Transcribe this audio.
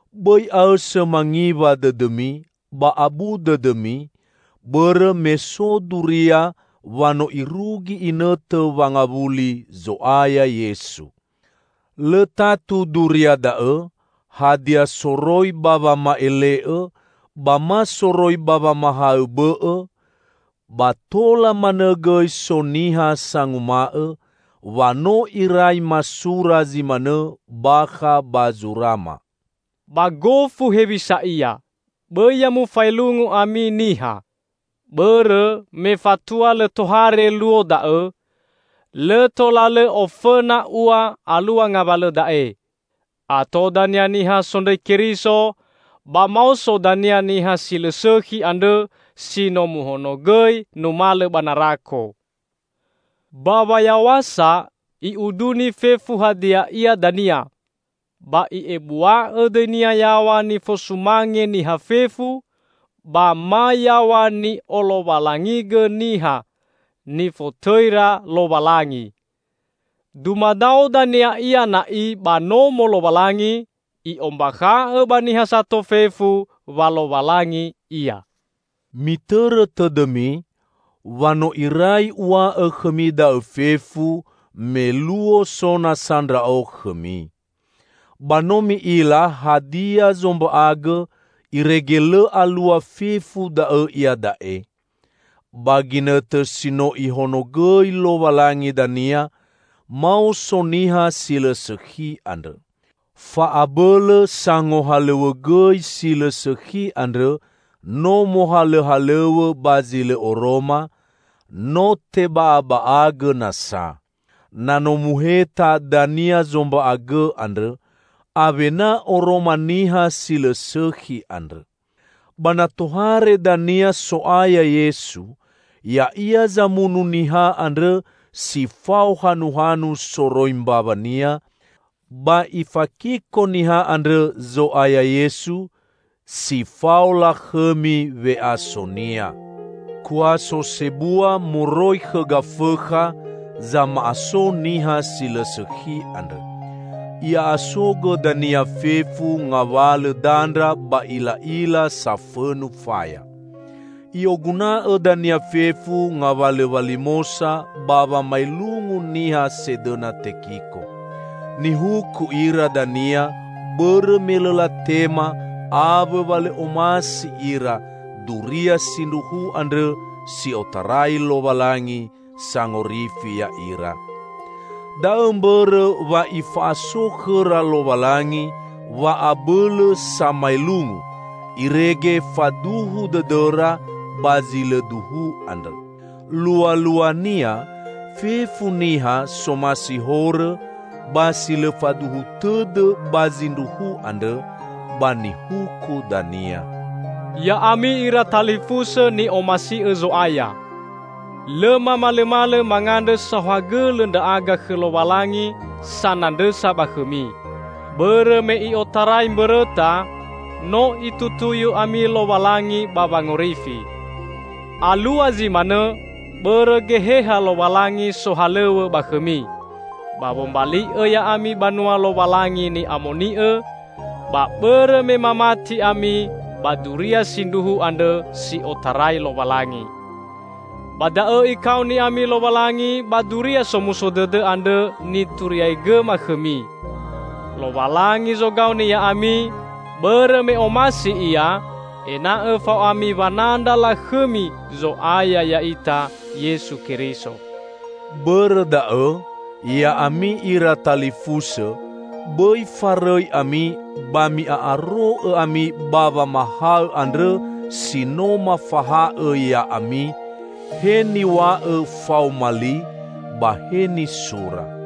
Bõi aõsõ mangiwa dõdõmi ba abu dõdõmi, bõrõ me so duria wa no irugi inõtõ wangawuli Zo'aya Yesu. Lõ tatu duria da'õ, hadia soroi ba wama'ele'õ, ba ma soroi ba wamahaõ bõ'õ; ba tola manõ gõi so niha sanguma'õ, wa no irai masura zi manõ bakha ba zurama. Ba gofu hewisa ia, bõi ya mufaelungu ami niha. Bõrõ me fatua lõ tohare Luo da'õ, lõ tola lõ ofõna ua alua ngawalõ da'e: Ato dania niha sondrõi Keriso, ba maoso dania Niha Si Lõ Sõkhi andrõ si no muhonogõi numalõ ba narako. Ba wayaw̃asa i'uduni fefu hadia ia dania, ba i'ebua'õ dõinia yaw̃a nifosumange niha fefu, ba ma yaw̃a ni'olowalangigõ niha nifotõira Lowalangi. Dumadao dania ia na'i ba Nomo Lowalangi, i'ombakha'õ ba niha sato fefu wa Lowalangi ia. Mitõrõ tõdõmi, wa no irai uw̃a'õ khõmi da'õ fefu, me luo so nasa ndra'o khõmi. Ba no mi'ila hadia zomba'agõ irege lõ alua fefu da'õ iada'e. Ba ginõtõ si no Ihonogõi Lowalangi dania, maoso Niha Si Lõ Sõkhi andrõ. Fa'abõlõ sangohalõw̃õgõi si lõ sõkhi andrõ no mohalõhalõw̃õ ba zi lõ oroma, no teba'aba'agõ nasa. Na no muheta dania zomba'agõ andrõ, awena oroma Niha Si Lõ Sõkhi andrõ. Ba na tohare dania So'aya Yesu, Ya'ia zamunu Niha andrõ si fao hanuhanu soroi mbawa-Nia, ba Ifakiko Niha andrõ Zo'aya Yesu si fao lakhõmi we'aso-Nia. Kuaso sebua moroi khõ Gafõkha zama'aso Niha Si Lõ Sõkhi andrõ. I'a'asogõ dania fefu ngawalõ dandra ba ila'ila safõnu faya. I'oguna'õ dania fefu ngawalõ walimosa ba wamaelungu niha sedõna tekiko. Nihuku ira dania bõrõ me lõ latema awõ wa lõ omasi ira duria sindruhu andrõ si otarai Lowalangi sangorifi ya'ira. Da'õ mbõrõ wa Ifa'aso khõra Lowalangi wa'abõlõ samaelungu, irege faduhu dõdõra ba zi lõ duhu andrõ. Lualuania, fefu niha somasi horõ ba si lõ faduhu tõdõ ba zindruhu andrõ, ba nihuku dania. Ya'ami ira talifusõ ni'omasi'õ Zo'aya! Lõ mamalõmalõ mangandrõ saohagõlõ ndra'aga khõ Lowalangi sanandrõsa ba khõmi, bõrõ me i'otarai mbõrõta no Itutuyu ami Lowalangi ba wangorifi. Alua zi manõ bõrõ Geheha Lowalangi sohalõw̃õ ba khõmi, ba wombali'õ ya'ami banua Lowalangi ni'amoni'õ, ba bõrõ me mamati ami ba duria sindruhu andrõ si otarai Lowalangi. Ba da'õ Ikaoni ami Lowalangi ba Duria Somuso Dõdõ andrõ nituriaigõma khõmi. Lowalangi zogaoni ya'ami, bõrõ me omasi Ia ena'õ fao ami wanandra lakhõmi Zo'aya ya'ita Yesu Keriso. Bõrõ da'õ, ya'ami ira talifusõ, bõi farõi ami ba mi'a'aro'õ ami ba wamahaõ andrõ si no mafaha'õ ya'ami, he niw̃a'õ faoma li, ba he nisura.